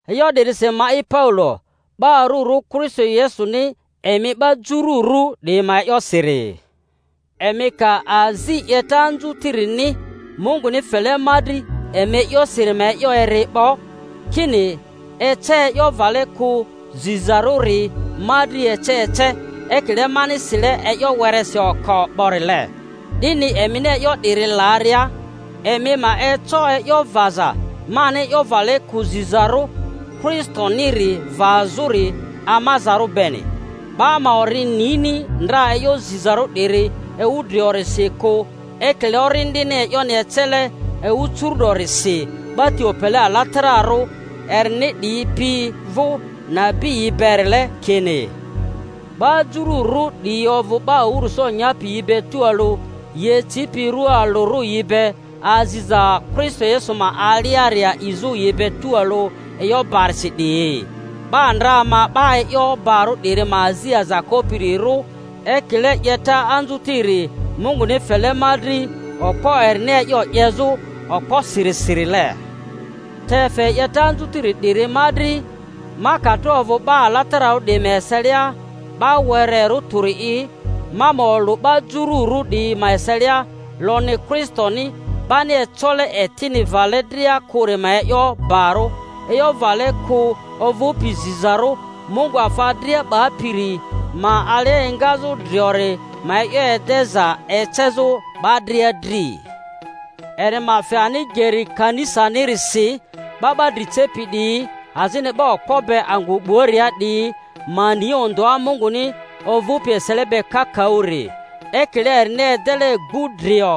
E'yo 'dirisi ma'i Paulo, 'ba arᴜrᴜ Kristo Yesuni emi 'ba Jururᴜ 'diyi ma e'yosiri— emi ka azi 'yeta anzuririni Munguni fele ma dri emi e'yosiri ma e'yo eri 'bo, kini ece e'yo vale kᴜ zizarᴜri ma dri ece ece, ekile mani sile e'yo weresi oko 'borile. 'Dini emini e'yo 'diri laria, emi ma eco e'yo vaza mani e'yo vale kᴜ zizarᴜ Kristoniri vazᴜri amazarᴜ beni. 'Ba ma ori nini ndra e'yo zizarᴜ 'diri ewu driorisi kᴜ ekile Orindini e'yoni ecele ewu curu-'dorisi 'ba ti opele alatararᴜ erini 'diyi pi vᴜ nabiyi berile, kini, 'ba Jururᴜ 'diyi ovᴜ 'ba awᴜrᴜso nyapi yi be tualᴜ, yi ecipi rua alᴜrᴜ yi be, aziza Kristo Yesu ma aliari a'izᴜ yi be tualᴜ e'yo barisi 'diyi. 'Ba ndra ma 'ba e'yo barᴜ 'diri ma azi aza kopirirᴜ, ekile 'yeta anzutiri Munguni fele ma dri okpo erini e'yo 'yezᴜ okposirisirile. Te fe 'yeta anzutiri 'diri ma dri, ma ka tro ovᴜ 'ba alatararᴜ 'diyi ma eselia 'ba wererᴜ tᴜri'i, ma ma olᴜ 'ba Jururᴜ 'diyi ma eselia lonyi Kristoni 'bani ecole etini vale dria kᴜri ma e'yo barᴜ, e'yo vale kᴜ ovᴜpi zizarᴜ Mungu afa dria 'bapiri ma alia engazᴜ driori ma e'yo edeza ecezᴜ 'ba dria dri; eri ma fe ani geri kanisanirisi 'ba 'ba dri cepi 'diyi azini 'ba okpo be angᴜ 'buaria 'diyi ma ni ondᴜa Munguni ovᴜpi esele be kakaᴜri; ekile erini edele gbu-drio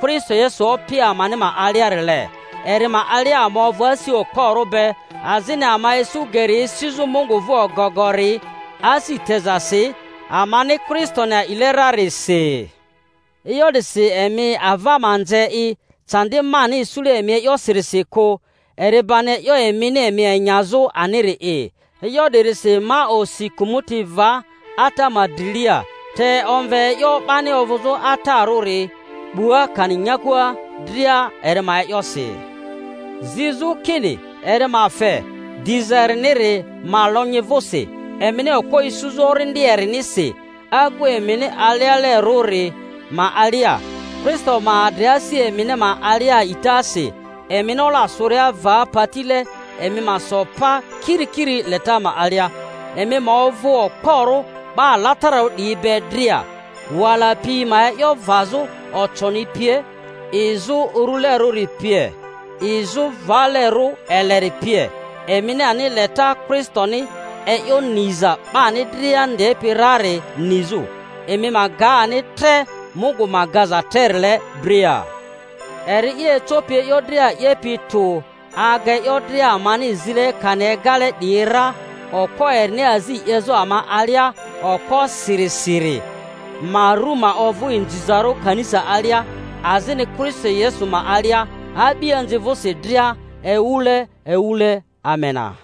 Kristo Yesu Opi amani ma aliarile. Eri ma alia ama ovᴜ asi okporᴜ be azini ama isu geri esizᴜ Mungu vᴜ ogogori asi tezasi, amani Kristoni a'ile rarisi. E'yo 'disi emi ava ma nze i candi mani isule emi e'yosirisi kᴜ; eri bani e'yo emini emi enyazᴜ aniri'i. E'yo 'dirisi ma osi kᴜmᴜti va Ata ma drilia, te omve e'yo 'bani ovᴜzᴜ atarᴜri 'bua kani nyakua dria eri ma e'yosi, zizᴜ kini eri ma fe, diza eriniri ma lonyi vᴜsi, emini okpo isuzᴜ Orindi erinisi agu emini alealerᴜri ma alia, Kristo ma adri asi emini ma alia a'itasi; emini ola sᴜria va patile emi ma so pa kirikiri leta ma alia, emi ma ovᴜ okporᴜ 'ba alatararᴜ 'diyi be dria, wala pi ma e'yo vazᴜ, oconi pie, izᴜ urulerᴜri pie, izᴜ valerᴜ eleri pie, emini ani leta Kristoni e'yo niza 'bani dria ndepi rari nizᴜ, emi ma ga ani tre Mungu ma gaza trerile dria. Eri'i ecopi e'yo dria 'yepi tᴜ aga e'yo dria amani zile kani egale 'diyi ra, okpo erini azi 'yezᴜ ama alia okposirisiri ma ru ma ovᴜ inzizarᴜ kanisa alia, azini Kristo Yesu ma alia, a'bianzi vᴜsi dria, ewule ewule. Amena.